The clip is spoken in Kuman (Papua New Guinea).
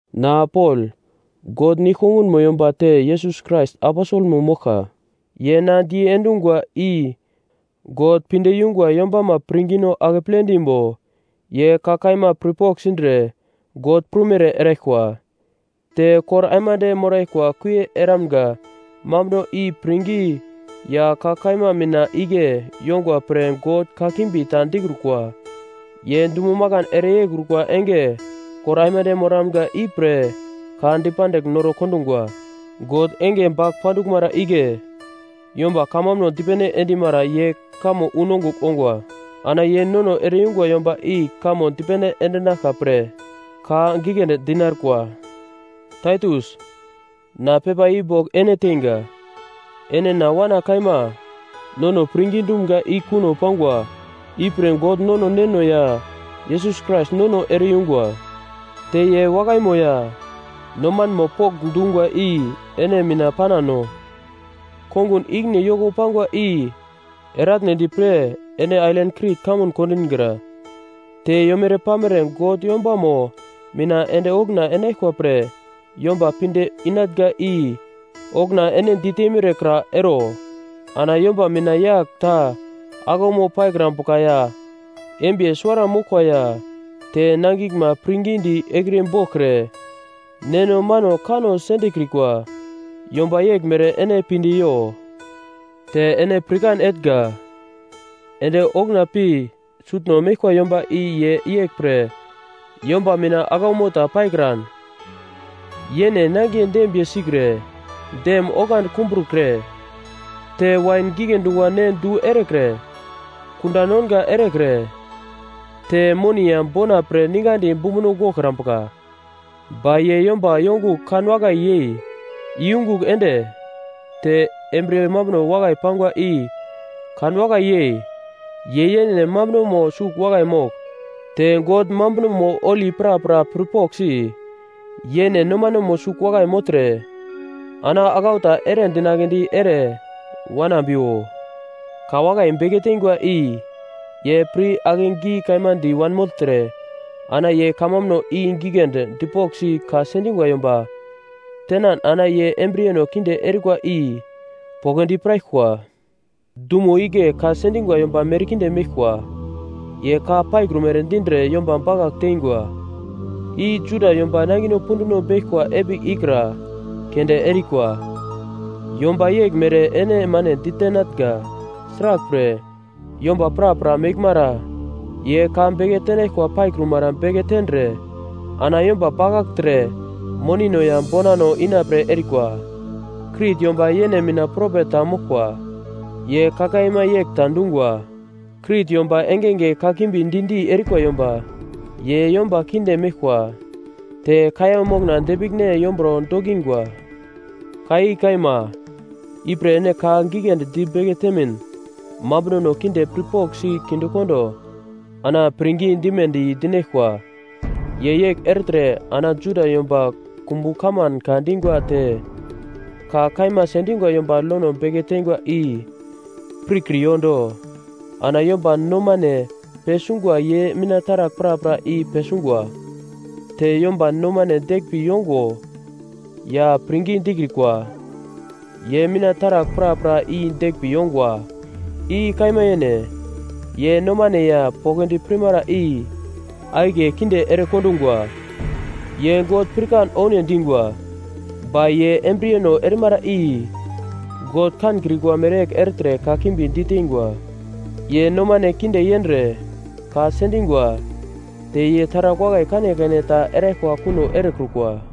Na Pol, God nigl-kongunmo yomba te Yesus Krais aposelmo moglka. Ye na diendungwa i God pinde yungwa yombama pirngino akeple dimbo ye ka kaima pirpogl sindre God prumere eraglkwa, te kor aimande moraglkwa kuie eramga mambuno i pirngi ya ka kaima mina igle yongwa pre God kakimbi ta dikrukwa. Ye dumo makan ere yeikrukwa enge kor aimande moramga ipre ka dipandigl noro kondungwa. God enge bagl panduglmara igle yomba kamambuno dipene endimara yu kamo unongugl ongwa. Ana ye nono ere-yungwa yomba i kamo dipene endinaglka pre ka giglendi di narikwa. Taitus, na pepa i bogl ene teinga. Ene na wana kaima. Nono pirngi dumga i kuno pangwa, ipre God nono Neno ya Yesus Krais nono ere-yungwa, te ye wakaimo ya nomanmo pokndungwa i ene mina panano. Kongun ikine yoko pangwa i eratnedi pre ene ailan Krit kamun kondingra, te yomere-pamere God yombamo mina ende okuna enaglkwa pre yomba pinde inatnga i okuna ene diteimere kra ero. Ana yomba mina yagl ta aglaumo paikrambuka ya embiye suwara moglkwa ya te nangiglma pirngidi ekriye boglkre, neno mano kanno sendekrikwa; yomba yeglmere ene pinde yo. Te ene pirkan etnga, ende okuna pi sutno meglkwa yomba i ye yeglpre yomba mina aglaumo ta paikran, yene nangiye dembiye sikre, dem oglandi kumbrukre te wain gigle dungwa ne du erekre, kunda nonga erekre, te moni ya bona pre ningadi bumbuno goglkrambuka. Ba ye yomba yongugl kan wakai yei iyungugl ende, te embriye mambuno wakai pangwa i kanwakai yei, ye yene mambunomo sugl wakai mogl, te God mambunomo holi prapra pirpoglsi, yene nomanemo sugl wakai mogltre ana aglau ta ere dinagledi ere wanambiwo. Ka wakai beke tengwa i ye pir akegi kaima di wanmogltre ana ye kamambuno i giglendi dipoglsi ka sendingwa yomba tenan ana ye embriyeno kinde erikwa i poglodi piraglkwa. Dumo igle ka sendingwa yomba merkinde meglkwa. Ye ka paikrumere dindre yomba bakagl tengwa. I Juda yomba nangino punduno beglkwa epigl ikra keunde erikwa. Yomba yeglmere ene mane ditenatnga. Sraglpre yomba prapra meglmara ye ka beke tenaglkwa paikrumara beke tendre ana yomba bakagltre monino ya bonano inapre erikwa. Krit yomba yene mina propet ta moglkwa, ye ka kaima yegl ta dungwa: “Krit yomba engenge kakimbi di-di erikwa yomba. Ye yomba kinde meglkwa, te kaiya mokna depiglne yomburo dokingwa.” Ka i kaima. Ipre ene ka giglendi di beke temin mambunono kinde pirpoglsi kinde kondo ana pirngi dimedi dinaglkwa. Ye yegl ertre ana Juda yomba kumbu kaman ka dingwa te ka kaima sendingwa yomba lono beke tengwa i pirkriyo do. Ana yomba nomane pesungwa ye mina taragl prapra i pesungwa. Te yomba nomane deglmbi yongo ya pirngi dikrikwa, ye mina taragl prapra i deglmbi yongwa. I kaima yene. Ye nomane ya poglodi pirmara i akiye kinde erekondungwa. Ye God pirkan oune dingwa, ba ye embriyeno erimara i God kankrikwa mereyegl ertre kakimbi ditengwa. Ye nomane kinde yendre, ka sendingwa, te ye taragl wakai kanekane ta eraglkwa kuno erekrukwa.